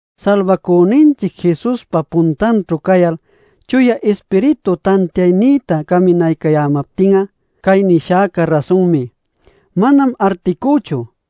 Salbacüninchic Jesuspa puntanćhu cayal Chuya Ispiritu tantiaynïta caminaycayämaptin'a, cay nishäca rasunmi; manam articüchu: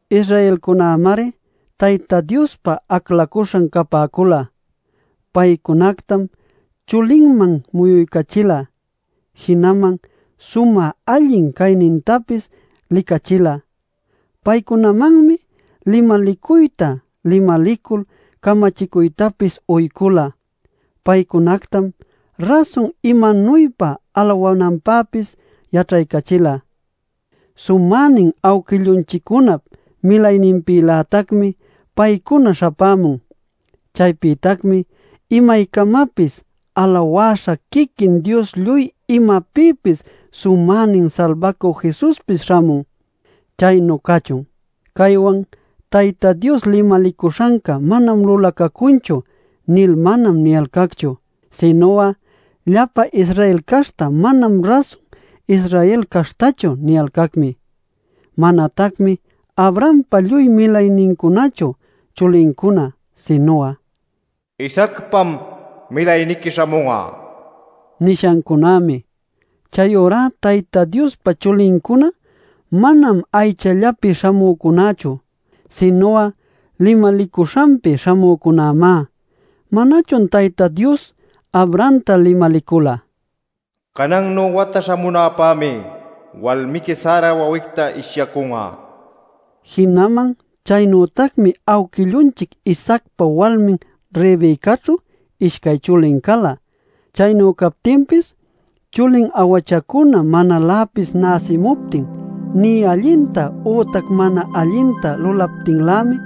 Israelcunämari Tayta Diospa aclacuśhan capäcula. Paycunactam chulinman muyuycachila. Jinaman sumä allin caynintapis licachila. Paycunamanmi limalicuyta limalicul camachicuytapis uycula. Paycunactam rasun imanuypa alawananpäpis yaćhaycachila. Sumänin awquillunchiccunap milayninpïlätacmi paycuna śhapämun. Chaypïtacmi imaycamapis alawäśha quiquin Dios lluy imapïpis sumänin Salbacü Jesuspis śhamun. ¡Chaynu cachun! Caywan “Tayta Dios limalicuśhanca manam lulacacunchu” nil manam niyalcacchu. Sinu'a “Llapa Israel caśhta manam rasun Israel caśhtachu” niyalcacmi. Manatacmi Abrahampa lluy milaynincunachu chulincuna, sinu'a “Isaacpam milayniqui śhamun'a” nishancunämi. Chayurá Tayta Diospa chulincuna manam aychallapi śhamücunächu, sinu'a limalicuśhanpi śhamücunämá. ¿Manachun Tayta Dios Abrahamta limalicula: “Canannu wata śhamunäpämi walmiqui Sara wawicta ishyacun'a” nil? Jinaman chaynütacmi awquillunchic Isaacpa walmin Rebecaćhu ishcay chulin cala. Chaynu captinpis, chulin awachacuna manaläpis näsimuptin, nï allinta ütac mana allinta lulaptinlämi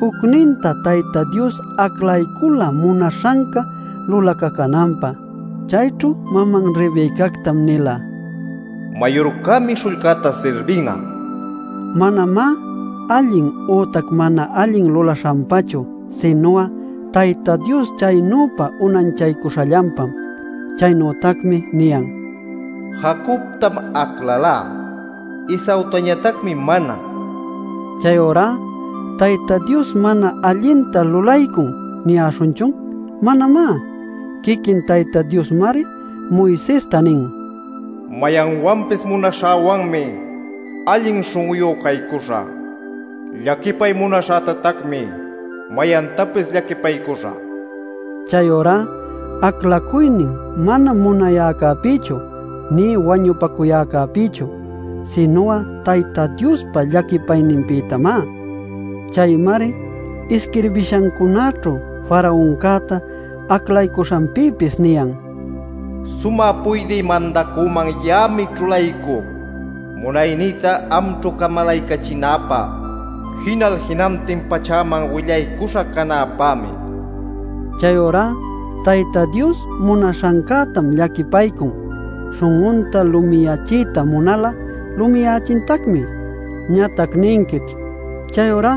jucninta Tayta Dios aclaycula munaśhanca lulacacunanpä. Chayćhu maman Rebecactam nila: “Mayurcämi śhullcäta sirbin'a” nil. Manamá allin ütac mana allin lulaśhanpachu, sinu'a Tayta Dios chaynüpa unanchaycuśhallanpam. Chaynütacmi niyan: “Jacobtam aclalá; Esaütañatacmi mana” nil. Chayurá ¿“Tayta Dios mana allinta lulaycun” niyäśhunchun? ¡Manamá! Quiquin Tayta Diosmari Moisesta nin: “Mayanwanpis munaśhäwanmi allin śhun'uyu caycuśhä; llaquipay munaśhätatacmi mayantapis llaquipaycuśhä” nil. Chayurá aclacuynin manam munayäcäpïchu nï wañupacuyäcäpïchu, sinu'a Tayta Diospa llaquipayninpïtamá. Chaymari isquirbishancunaćhu Faraoncäta aclaycuśhanpïpis niyan: “Sumä puydï mandacüman ya'ami ćhulaycuc munaynïta amćhu camalaycachinäpä; jinal jinantin pachäman willaycuśha canäpämi” nil. Chayurá Tayta Dios munaśhancätam llaquipaycun; śhun'unta lumiyachiyta munal'a lumiyächintacmi. Ñatac ninquićh: “Chayurá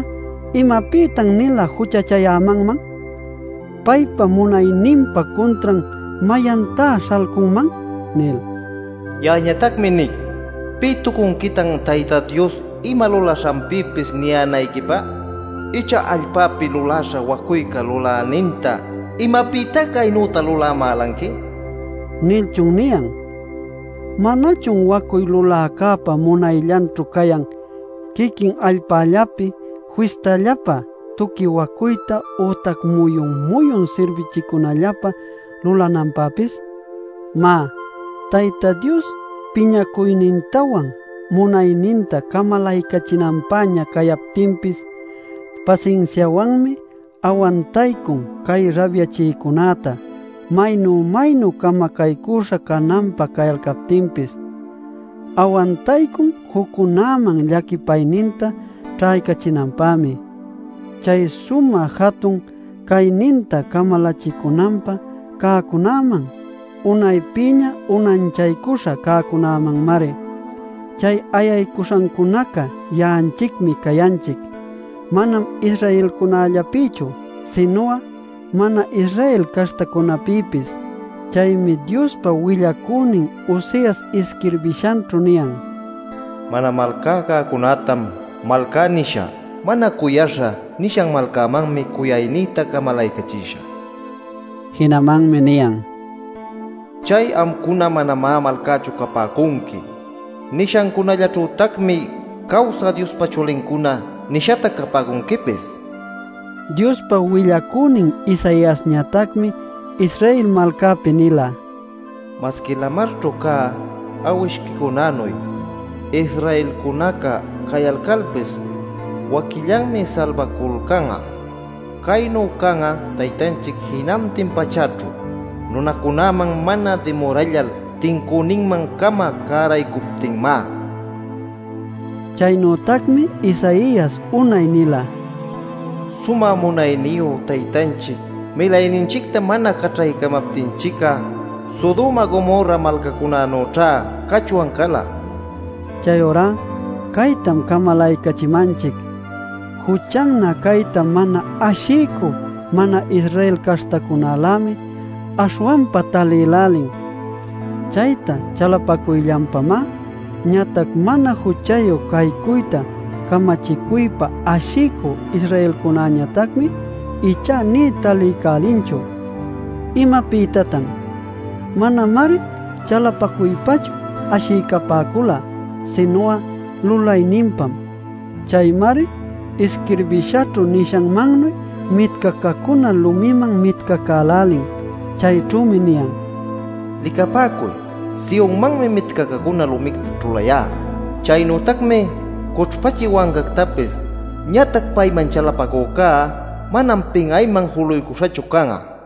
¿imapïtan-nila juchachayämanman? ¿Paypa munayninpa cuntran mayantá śhalcunman?” nil. Ya'añatacmi nic: ¿Pï tucunquitan Tayta Dios ima lulaśhanpïpis niyänayquipä? ¿Icha allpapi luläśha wacuyca luläninta “¿Imapïtá caynüta lulamälanqui?” nilchun niyan? ¿Manachun wacuy luläcäpa munayllanćhu cayan quiquin allpallapi fistallapä tuqui wacuyta ütac muyun-muyun sirbichicunallapä lulananpäpis? Má, Tayta Dios piñacuynintawan munayninta camalaycachinanpäña cayaptinpis pasinsiawanmi awantaycun cay rabyachïcunäta maynu-maynu camacaycüśha cananpä cayalcaptinpis. Awantaycun juccunäman llaquipayninta ćhaycachinanpämi, chay sumä jatun cayninta camalachicunanpä cäcunaman, unaypïña unanchaycuśha cäcunämanmari. Chay ayaycuśhancunaca ya'anchicmi cayanchic, manam Israelcunallapïchu, sinu'a mana-Israel caśhtacunäpïpis. Chaymi Diospa willacünin Oseas isquirbishanćhu niyan: “Mana malcá cäcunätam ‘malcá’ nishä. ‘Mana cuyaśha’ nishan malcamanmi cuyacuynïta camalaycachishä” nil. Jinamanmi niyan: “Chay ‘Amcuna manamá malcächu capäcunqui’ nishacunällaćhütacmi ‘Cawsä Diospa chulincuna’ nishatac capäcunquipis” nil. Diospa willacünin Isaiasñatacmi Israel malcapi nila: “Masqui lamarćhu cä awishquicunänuy Israelcunaca cayalcalpis, waquillanmi salbaculcan'a. Caynu can'a Taytanchic jinantin pachäćhu nunacunäman mana dimurällal tincüninman-cama cäraycuptinmá” nil. Chaynütacmi Isaias unay nila: “Sumä munayniyu Taytanchic milayninchicta mana caćhaycamaptinchic'a, Sodoma Gomorra malcacunanüćha cachwan cala” nil. Chayurá caytam camalaycachimanchic: juchannä cayta mana ashiycü mana-Israel caśhtacunälämi aśhwanpa talïlälin. Chayta chalapacuyllanpamá. Ñatac mana juchayu caycuyta camachicuypa ashiycü Israelcunäñatacmi ichá nï taliycälinchu. ¿Imapïtatan? Manamari chalapacuypachu ashiycapäcula, sinu'a lulayninpam. Chaymari isquirbishaćhu nishanmannuy mitcacacuna lumïman mitcacälälin. Chayćhümi niyan: “Licapäcuy, Sionmanmi mitcacacuna lumicta ćhulayá; chaynütacmi cućhpachï wancactapis. Ñatac payman chalapacücá manam pin'ayman juluycuśhachu can'a” nil.